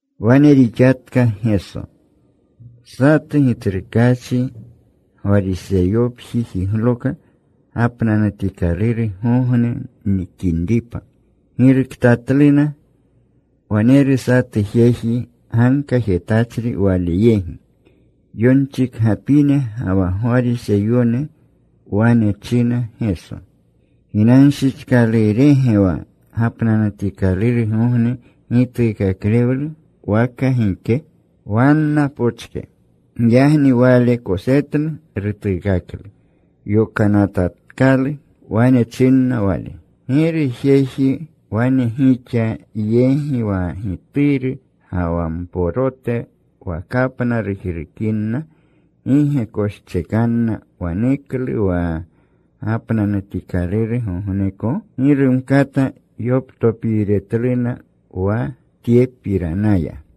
Wane rixatka Geso. Satu gitsrukaachi Gwariseyopji jigloka gapnanutikalurgogne nikinripa. Giruktatluna. Waneru satu jeji gankajetachri Wale yegi. Yonchikgapine ga wa Gwariseyone wane china Geso, “¿Ginanshichkalurege wa gapnanutikalurgogne gituukaklewlu waka gike?” Wanna pochke. Giyagni Wale kosetlu. Rutuukaklu. Yokanatatkalu. Wane chinna Wale, “¿Giru jeji wane gixa yegi, wa gituru ga wa mporote wa kapna rujrukinna, gi ge koschekanna waneklu wa gapnanutikalurgogneko?” Gi rumkata yoptopiiretluna wa tyepiranaya.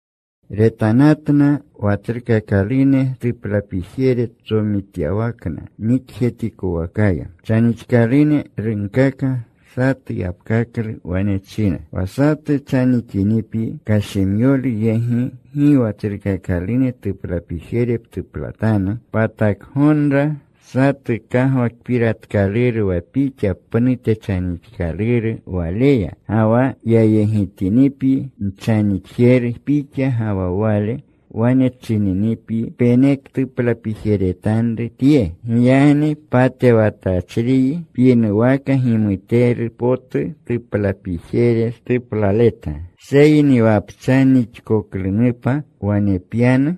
Retanatna wa tsrukakalune tuplapijere tsomityawakna nikjetikowakaya. Chanixkalune runkaka satu yapkaklu. Wane chinna, “Wa satu chanixinipyi kashimyolu yegi, gi wa tsrukakalune tuplapijere ptuplatanu. Patako gonra satu kagwakpiratkaluru wa pixa pnute chanixkaluru waleya. Ga wa yayegitinipyi nchanixjeru pixa ga wa wale, wane chininipyi, ‘Penektuplapijeretanru tye.’ Giyagni patewatachriyi pyinuwaka gimuteru potu tuplapijere tuplaleta. “Seyni wa pchanixkoklunupa, wane pyanu.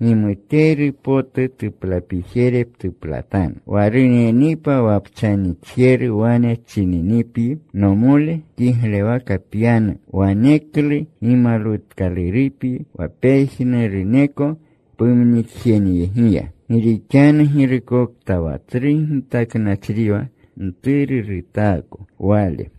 Gimuteru potu tuplapijere ptuplatanu, wa runinipa wa pchanixjeru, wane chininipyi, ‘Nomole, kiglewaka pyanu.’ Waneklu gimalwutkalurupyi wa pejnuruneko pumnikjenyegiya. Gi rixanu girukokta wa tsru gitaknachriwa mturu rutaako wale.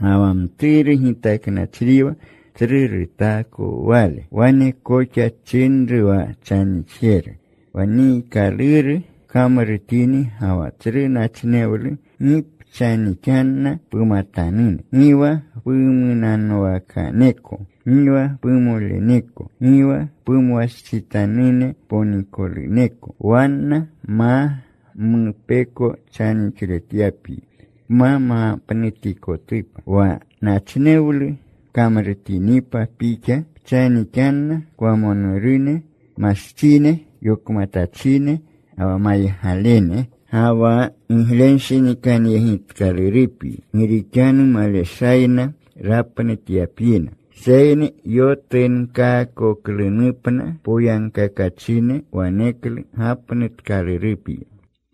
Ga wa mturu gitaknachriwa tsru rutaako wale.” Wane koxa chinru wa chanixjeru, “Wa niikaluru pkamrutini ga wa tsru nachnewlu, gi pchanixanna pumatanune, gi wa pumunanwakaneko, gi wa pumoleneko, gi wa pumwastsitanune ponikoluneko, wanna ma mupeko chanixletyanupyi, pma mapnutikotupa. Wa nachnewlu pkamrutinipa pixa, pchanixanna kwamonurune, mastsine, yokmatachine, ga wa maygalene. Ga wa giglenshinikanyegitkalurupyi, gi rixanu maleshayna rapnutyapyina. Seyni yotunkoklunupna poyagkakachine, waneklu gapnutkalurupyi.”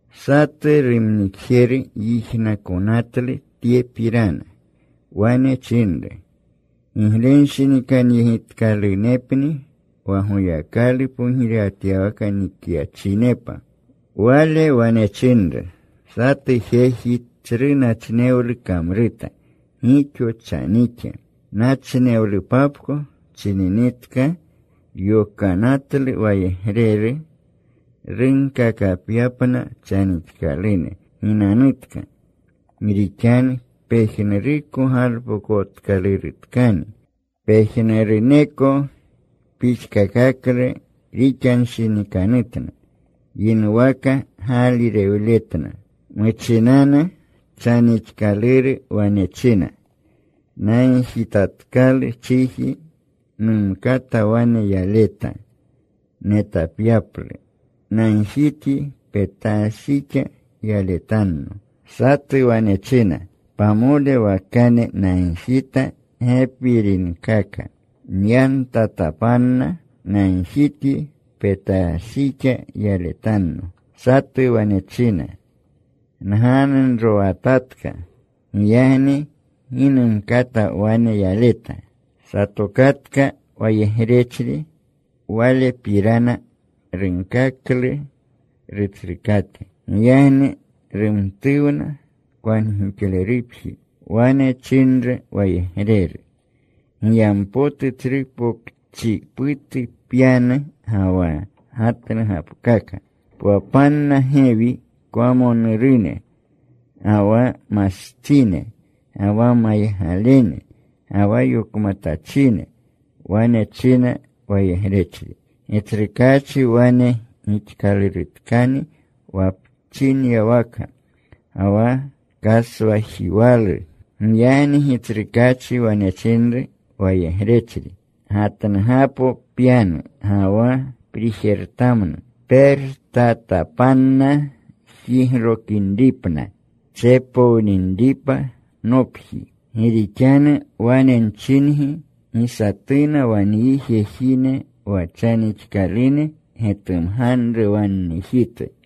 Satu rumnikjeru yijnakonatlu tyepirana. Wane chinru, “Giglenshinikanyegitkalunepni wa Goyakalu pogirewatyawaka nikyachinepa.” Wale wane chinru, “Satu jeji tsru nachnewlu kamruta. Gixo chanixa. Nachnewlupapko chininitka, yokanatlu wayegreru, runkakapyapna chanixkalune, ‘Ginanutka. Gi rixanu pejnuruko galpokotkalurutkani.’ “Pejnuruneko pixkakaklu rixanshinikanutna. Yinuwaka gaalirewletna. Muchinanu chanixkaluru wane china, ‘Nagjitatkalu chiji. Numkata wane yaleta, netapyaplu. Nagjityi petashjixa yaletanno.’ “Satu wane china, ‘Pamole wakane nagjita gepirinkaka. Nyantatapanna. Nagjityi petashjixa yaletanno.’ “Satu wane china, ‘Nganunrowatatka. Giyagni gi numkata wane yaleta.’ “Satokatka wayegrechri. Walepirana runkaklu rutsrukate. Giyagni rumtuwna kwangixlerupji. Wane chinru wayegreru, ‘Giyampotu tsru pokchiputu pyanu ga wa gatnugapkaka. Pwapanna gewi kwamonurune, ga wa mastsine, ga wa maygalene, ga wa yokmatachine.’ “Wane china wayegrechri, ‘Gitsrukaachi, wane gixkalurutkani wa pchinyawaka, ga wa kaswajiwalu.’ “Giyagni gitsrukaachi wane chinru wayegrechri, ‘Gatnugapo pyanu ga wa prijertamnu. Pertapanna jiglokinripna, tsepowninripa nopji. Gi rixanu wane nchingi, gi satuna wa nyi jejine wa chanixkalune getumganru wa nnijitu.’”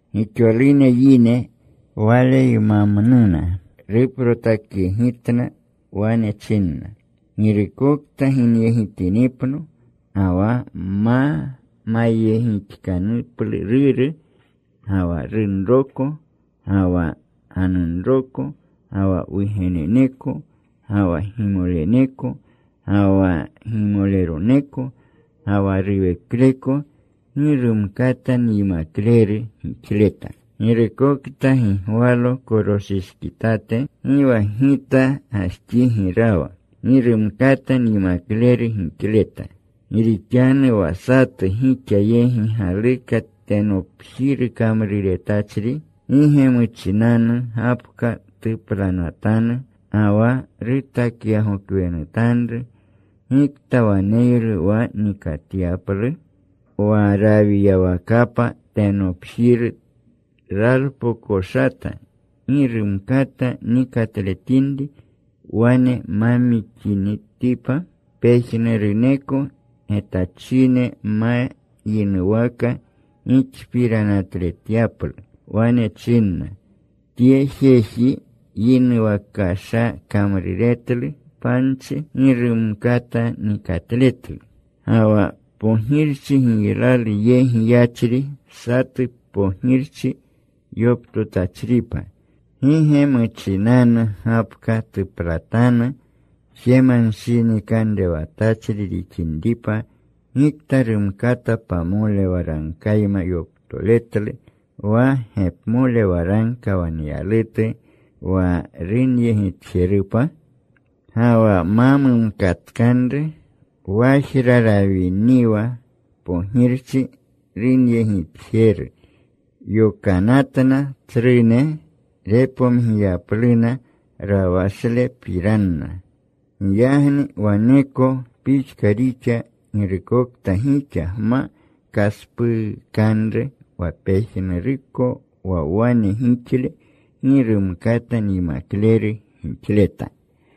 Gixolune yine Waleymamnuna. Ruprotakyegitna. Wane chinna, “Girukokta ginyegitinipno ga wa ma mayegixkanuplu ruru, gi wa runroko, ga wa ganunroko, ga wa wugeneneko, ga wa gimoleneko, ga wa gimoleroneko, ga wa ruwekleko, gi rumkata nyimakleru gixleta. Girukokta gi gwalo koroshishkitate, gi wa Gita gajxigi rawa, gi rumkata nyimakleru gixleta. “Gi rixanu wa satu gixa yegi galuka tenopjiru kamruretachri, ¿gi ge muchinanu gapka tuplanatanu ga wa rutakyagokwenutanru, gikta waneylu wa nikatyaplu? Rawiyawakapa tenopjiru ralpokoshata, gi rumkata nikatletinripa wane ma mixinitipa, pejnuruneko getachine ma yinuwaka gixpiranatletyapluna. Wane chinna, ‘Tye jeji yinuwakasha kamruretlu panchi. Gi rumkata nikatletlu.’ “Ga wa pogirchi giylalu yegi yachri satu pogirchi yoptotachripa, ¿gi ge muchinanu gapka tuplatanu jemanshinikanrewatachri rixinripa gikta rumkata pamole waragkayma yoptoletlu wa gepmole waragka waneyalutu wa runyegitjerupa? Ga wa ma mumkatkanru, wajra rawiniwa pogirchi runyegitjeru, yokanatna tsrune, repomgiyapluna rawashletnapirana. Giyagni waneko pixka rixa. Girukokta gixa gma kaspuukanru wa pejnuruko wa wane gixle gi rumkata nyimakleru gixleta.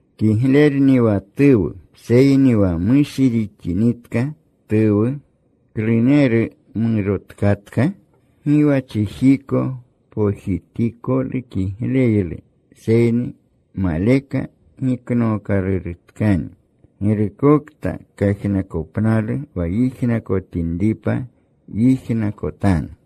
“Kiglerni wa tuwu. Seyni wa mushi rixinitka tuwu ¿kluneru morotkatka? Gi wa chijiko pojitikolu kigleylu, seyni maleka giknookalurutkani. “Girukokta kajnakopnalu wa yijnakotinripa, yijnakotanu.”